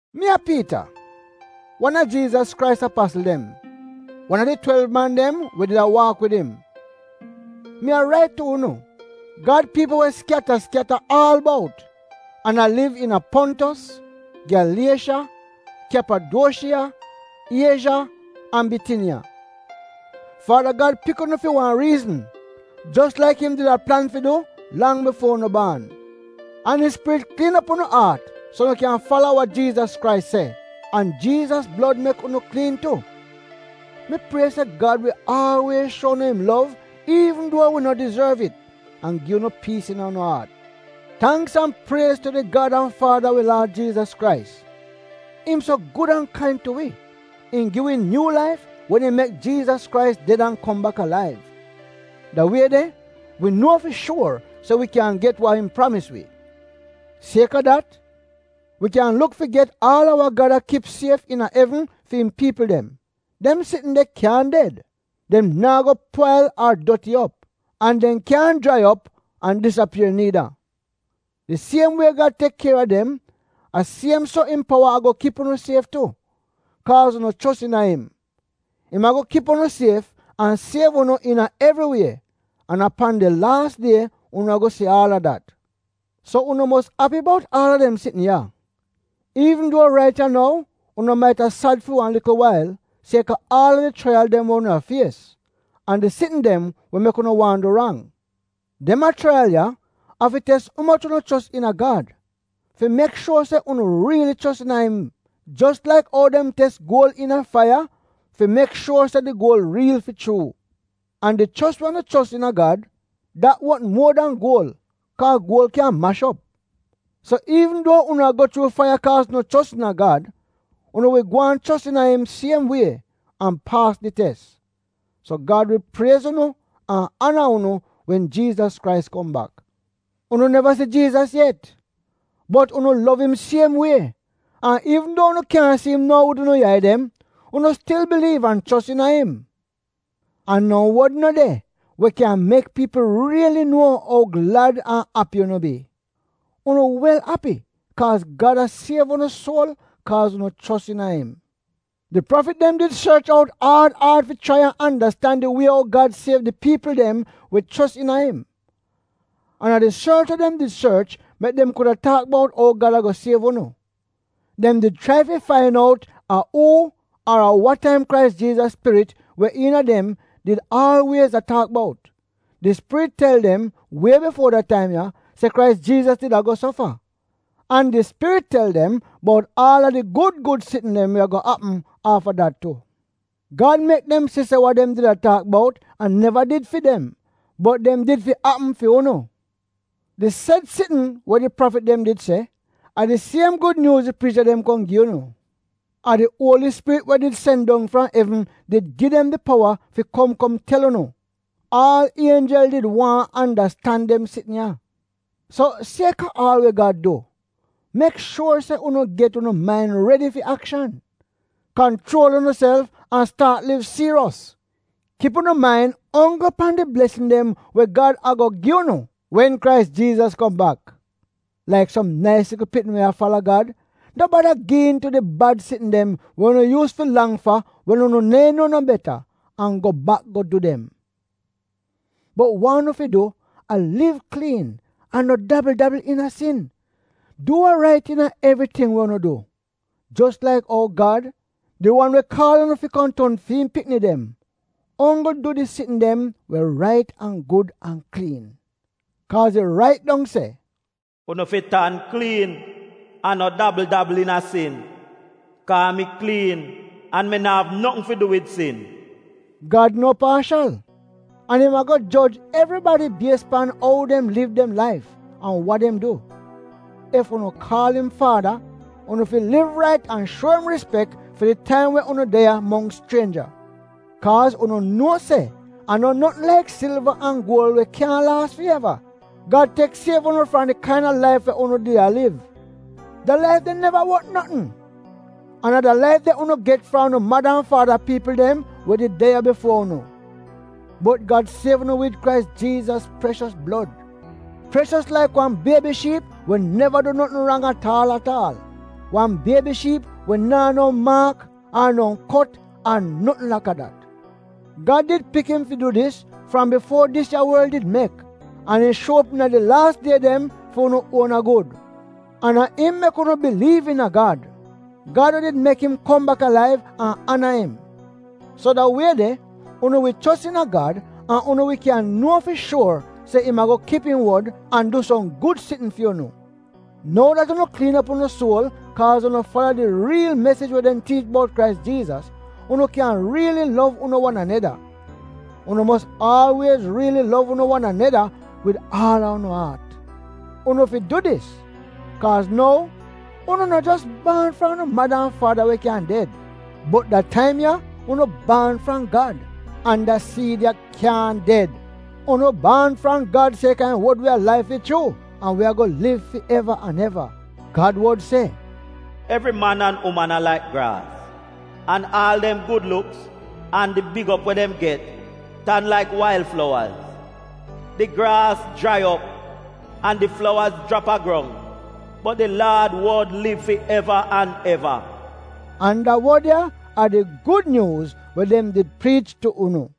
Mi a Piita, wan a Jiizas Krais apasl dem — wan a di twelv man dem we did a waak wid im. Mi a rait tu unu, Gad piipl we skyata-skyata aal bout an a liv iina Pontos, Gyaliesha, Kyapaduoshiya, Iezha, an Bitiniya. Faada Gad pik unu fi wan riizn, jos laik im did a plan fi du lang bifuo unu baan. An im Spirit kliin op unu aat so unu kyan fala wa Jiizas Krais se. An Jiizas blod mek unu kliin tu. Mi prie se Gad wi aalwiez shuo unu im lov iivn duo wi no dizorv it an gi unu piis iina unu aat. Tangks an priez tu di Gad an Faada a wi Laad Jiizas Krais. Im so gud an kain tu wi, im gi wi nyuu laif wen im mek Jiizas Krais ded an kom bak alaiv. Da wie de, wi nuo fi shuor se wi kyan get wa im pramis wi. Sieka dat, wi kyan luk fi get aal a wa Gad a kip sief iina evn fi im piipl dem. Dem sitn de kyaahn ded. Dem naa go pwail ar doti op. An dem kyaahn jrai op an disapier niida. Di siem wie Gad tek kier a dem, a siem so im powa ago kip unu sief tu, kaaz unu chos iina im. Im ago kip unu sief an siev unu iina evri wie, an a pan di laas die unu ago si aal a dat. So unu mos api bout aal a dem sitn ya, iivn duo rait ya nou unu maita sad fi wan likl wail sieka aal a di chraiyal dem we unu a fies, an di sitn dem we mek unu waahn du rang. Dem ya chraiyal ya, a fi tes umoch unu chos iina Gad, fi mek shuor se unu riili chos iina im, jos laik ou dem tes guol iina faiya fi mek shuor se di guol riil fi chuu. An di chos we unu chos iina Gad — dat wot muo dan guol, kaa guol kyan mash op. So iivn duo unu a go chuu faiya kaa unu chos iina Gad, unu wi gwaan chos iina im siem wie an paas di tes, so Gad wi priez unu an ana unu wen Jiizas Krais kom bak. Unu neva si Jiizas yet, bot unu lov im siem wie; an iivn duo unu kyaahn si im nou wid unu yai dem, unu stil biliiv an chos iina im. An no wod no de, we kyan mek piipl riili nuo ou glad an api unu bi! Unu wel api kaaz Gad a siev unu suol kaaz unu chos iina im. Di prafit dem did sorch out aad aad fi chrai an andastan di wie ou Gad siev di piipl dem we chos iina im. An a di sorch we dem did sorch mek dem kuda taak bout ou Gad ago siev unu. Dem did chrai fi fain out a uu ar a wa taim Krais Jiizas Spirit, we iina dem, did aalwiez a taak bout. Di Spirit tel dem wie bifuo da taim ya se Krais Jiizas did ago sofa. An di Spirit tel dem bout aal a di gud gud sitn dem we ago apm afta dat tu. Gad mek dem si se wa dem did a taak bout a neva did fi dem, bot dem did fi apm fi unu. Di sed sitn we di prafit dem did se, a di siem Gud Nyuuz di priicha dem kom gi unu. A di Uoli Spirit, we did sen dong fram evn, did gi dem di powa fi kom kom tel unu — aal ienjel did waahn andastan dem sitn ya! So sieka aal we Gad du, mek shuor se unu get unu main redi fi akshan. Kanchuol unuself an staat liv siiriyos. Kip unu main onggl pan di blesn dem we Gad ago gi unu wen Jiizas Krais kom bak. Laik som nais likl pikni we a fala Gad, no bada gi iin tu di bad sitn dem we unu yuus fi lang fa wen unu neehn nuo no beta, an go bak go du dem. Bot wa unu fi du a liv kliin an no dabl-dabl iina sin. Du wa rait iina evriting we unu du, jos laik ou Gad, di wan we kaal unu fi kom ton fi im pikni dem, onggl du di sitn dem we rait an gud an kliin. Kaaz it rait dong se, “Unu fi tan kliin an no dabl-dabl iina sin, kaa mi kliin an mi na'av notn fi du wid sin.” Gad no paashal, an im ago joj evribadi bies pan ou dem liv dem laif an wa dem du. Ef unu kaal im Faada, unu fi liv rait an shuo im rispek fi di taim we unu de ya mongks chrienja. Kaaz unu nuo se a no notn laik silva an guol we kyaahn laas fi eva, Gad tek an siev unu fram di kaina laif we unu did a liv. Da laif de neva wot notn. An a da laif de unu get fram unu mada an faada piipl dem we did de ya bifuo unu. Bot Gad siev unu wid Krais Jiizas preshos blod, preshos laik wan biebi shiip we neva du notn rang at aal at aal; wan biebi shiip we naa no maak ar no kot ar notn laka dat. Gad did pik im fi du dis fram bifuo dis ya worl did mek an im shuo op iina di laas die dem fi unu uona gud. An a im mek unu biliiv iina Gad — Gad we did mek im kom bak alaiv an ana im. So da wie de unu wi chos iina Gad an unu wi kyan nuo fi shuor se im ago kip im wod an du som gud sitn fi unu. Nou dat unu kliin op unu suol kaaz unu fala di riil mesij we dem tiich bout Krais Jiizas, unu kyan riili lov unu wan aneda. Unu mos aalwiez riili lov unu wan aneda wid aal a unu aat. Unu fi du dis, kaaz nou, unu no jos baan fram unu mada an faada we kyan ded, bot da taim ya unu baan fram Gad — an da siid ya kyaahn ded. Unu baan fram Gad sieka im wod we alaiv fi chuu, an we ago liv fi eva an eva. Gad wod se, “Evri man an uman a laik graas, an aal dem gud luks, an di big op we dem get tan laik wail flowaz. Di graas jrai op an di flowaz jrap a grong, bot di Laad wod liv fi eva an eva.” An da wod ya a di Gud Nyuuz we dem did priich tu unu.